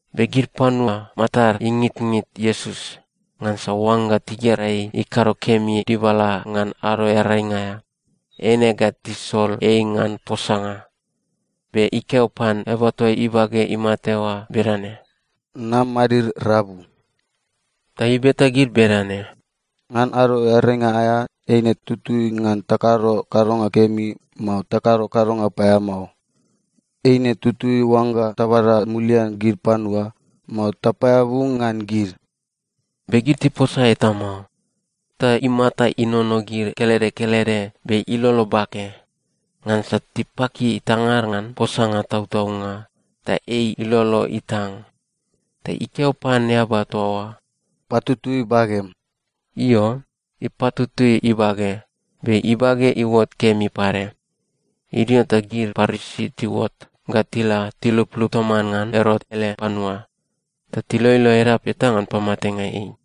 Be gid panua matad ingitngit Iesus, ngansa oangga tigera ei ikado kemi dibala ngan Ado Earainga aea, eine ga tisol ei ngan posanga. Be ikeo pan eaba toa ibage imate oa bedane, “Nam madid rabu.” Ta ibeta gid bedane, “Ngan Ado Earainga aea, eine tutui ngan takado kadonga kemi, mao takado kadonga paeamao? Eine tutui oangga tabada mulian gid panua, mao tapaeabu ngan gid?” Be gid tiposa eta mao. Ta imata inono gid kelede kelede be ilolo bake, ngansa tipaki tangad ngan posanga tautaunga, ta ei ilolo itang. Ta ikeo pan eaba toa oa, “Patutui bagem.” Io, ipatutui ibage, be ibage iuot kemi pade. Idio ta gid Parisi tiuot ga tila tiluplup toman ngan Erot ele panua, ta tiloilo edap eta ngan pamatenga ei.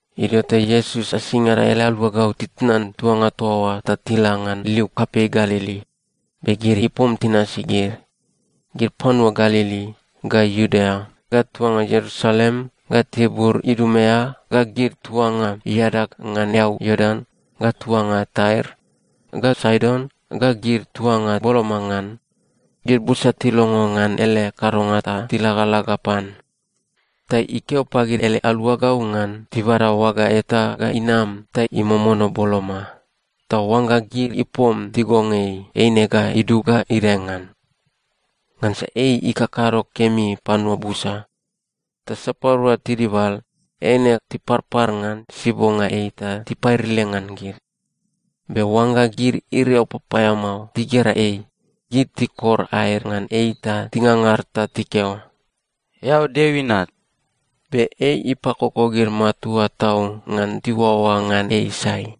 Idio ta Iesus asingada ele aluagau titnan tuanga toa oa ta tila ngan liu kapei Galili. Be gid ipom tinasi gid. Gid panua Galili, ga Iudea, ga tuanga Ierusalem, ga tibur Idumea, ga gid tuanga iadag ngan eau Iordan, ga tuanga Tair ga Saidon, ga gid tuanga boloma ngan, gid busa tilongo ngan ele kadonga ta tilagalaga pan. Ta ikeo pagid ele aluagau ngan tibada oaga eta ga inam ta imomono boloma, ta oangga gid ipom tigong ei, eine ga idug ga idae ngan. Ngansa ei ikakado kemi panua busa. Ta sapadua tidibal, eine tiparpar ngan sibonga ei ta tipairile ngan gid. Be oangga gid iriau papaeamao tigera ei, gid tikor aed ngan ei ta tingangar ta tikeo, “Eao Deo Inat.” Be ei ipakoko gid matua tau ngan tiuaoa ngan ei sai.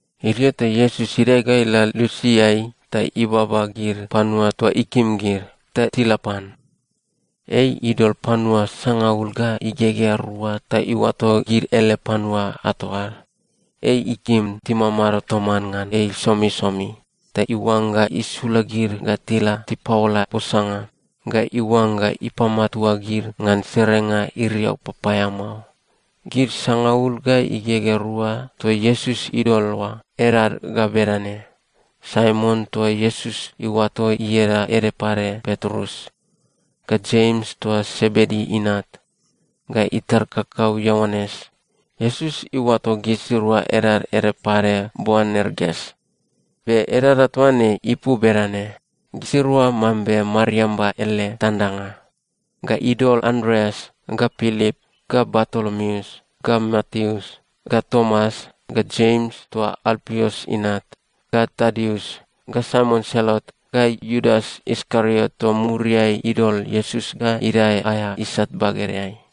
Idio ta Iesus idae ga ila lusiai ta ibaba gid panua toa ikim gid, ta tila pan. Ei idol panua sangaul ga igegea rua ta iuato gid ele panua ato ad. Ei ikim timamado toman ngan ei somisomi, ta iuangga isula gid ga tila tipaola posanga, ga iuangga ipamatua gid ngan serenga iriau papaeamao. Gid sangaul ga igegea rua toa Iesus idol oa, edad ga bedane: Saimon toa Iesus iuato ieda ede pade Petrus, ga Jems toa Sebedi inat, ga itar kakau Ioanes. (Iesus iuato gisirua edad ede pade Boanerges. Be edaeda toa ne ipu bedane: Gisirua mambe mariamba ele tandanga.) Ga idol Andreas, ga Pilip, ga Bartolomeus, ga Mateus, ga Tomas, ga Jems toa Alpius inat, ga Tadius, ga Saimon Selot, ga Iudas Iskariot toa muriai idol Iesus ga idae aea isat bagedeai.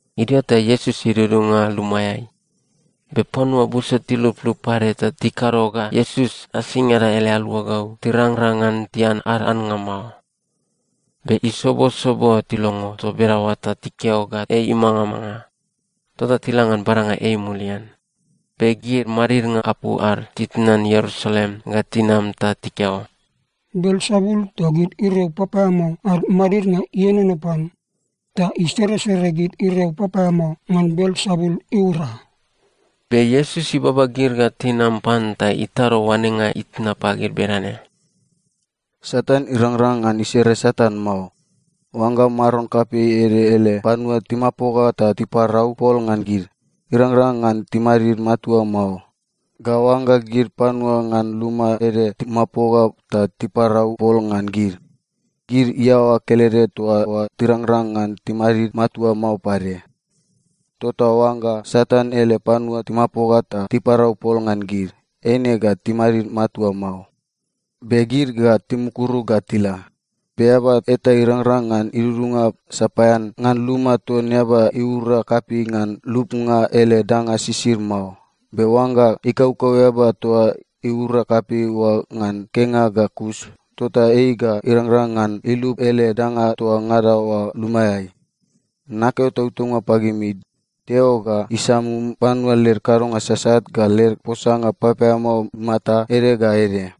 Idio ta Iesus idudunga lumaeai. Be panua busa tiluplup pade ta tikado ga Iesus asingada ele aluagau tirangrang ngan tian ad annga mao. Be isobosobo tilongo toa bedaoa ta tikeo ga ei imangamanga. Tota tila ngan badanga ei mulian. Be gid madidnga apu ad titnan Ierusalem ga tinam ta tikeo, “Belsebul toa gid iriau papaeamao ad madidnga ienono pan, ta iseresere gid iriau papaeamao ngan Belsebul iura.” Be Iesus ibaba gid ga tinam pan ta itado oanenga itna pagid bedane, “Satan irangrang ngan isere Satan mao. Oangga maron kapei ede ele panua timapoga ta tiparau pol ngan gid, irangrang ngan timadid matua mao. Ga oangga gid panua ngan luma ede timapoga ta tiparau pol ngan gid, gid iaoa kelede toa oa tirangrang ngan timadid matua mao pade. Tota oangga Satan ele panua timapoga ta tiparau pol ngan gid, eine ga timadid matua mao, be gid ga timukuru ga tila. Be eaba eta irangrang ngan idudunga sapaean ngan luma ton eaba iura kapei ngan lubnga ele danga sisid mao. Be oangga ikaukau eaba toa iura kapei oa ngan kenga ga kus, tota ei ga irangrang ngan ilub ele danga toa ngada oa lumaeai. Nakeo tautaunga pagimi, Deo ga isamum panua led kadonga sasat ga led posanga papaeamao imata ede ga ede,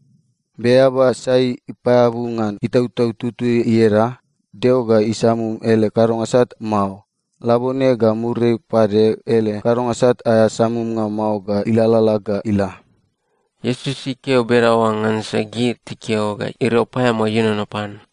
be eaba sai ipaeabu ngan Itautau Tutui ieda, Deo ga isamum ele kadonga sat mao. Labone ga muriai pade ele kadonga sat aea samumnga mao ga ilalala ga ila.” Iesus ikeo bedaoa ngansa gid tikeo ga iriau paeamao ienono pan.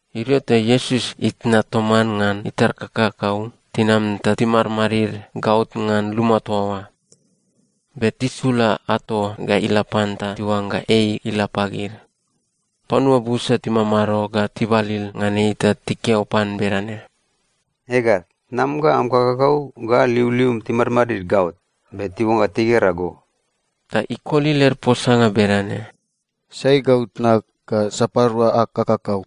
Idio ta Iesus itna toman ngan itar kakakau tinam ta timadmadid gaot ngan luma toa oa, be tisula ato ga ila pan ta tiuangga ei ila pagid. Panua busa timamado ga tibalil ngan ei ta tikeo pan bedane, “Ega, tnam ga am kakakau ga liulium timadmadid gaot, be tiuangga tigera go.” Ta ikoli led posanga bedane, “Sai gau tnag, ga sapadua ag kakakau?”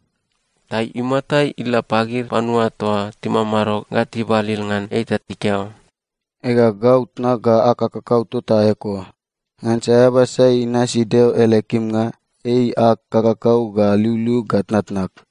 Ta imata ila pagid panua toa timamado ga tibalil ngan ei ta ikeo, “Ega, gau tnag ga ag kakakau tota eko. Ngansa eaba sai inasi Deo ele kimnga, ei ag kakakau ga liuliug ga tnatnag.”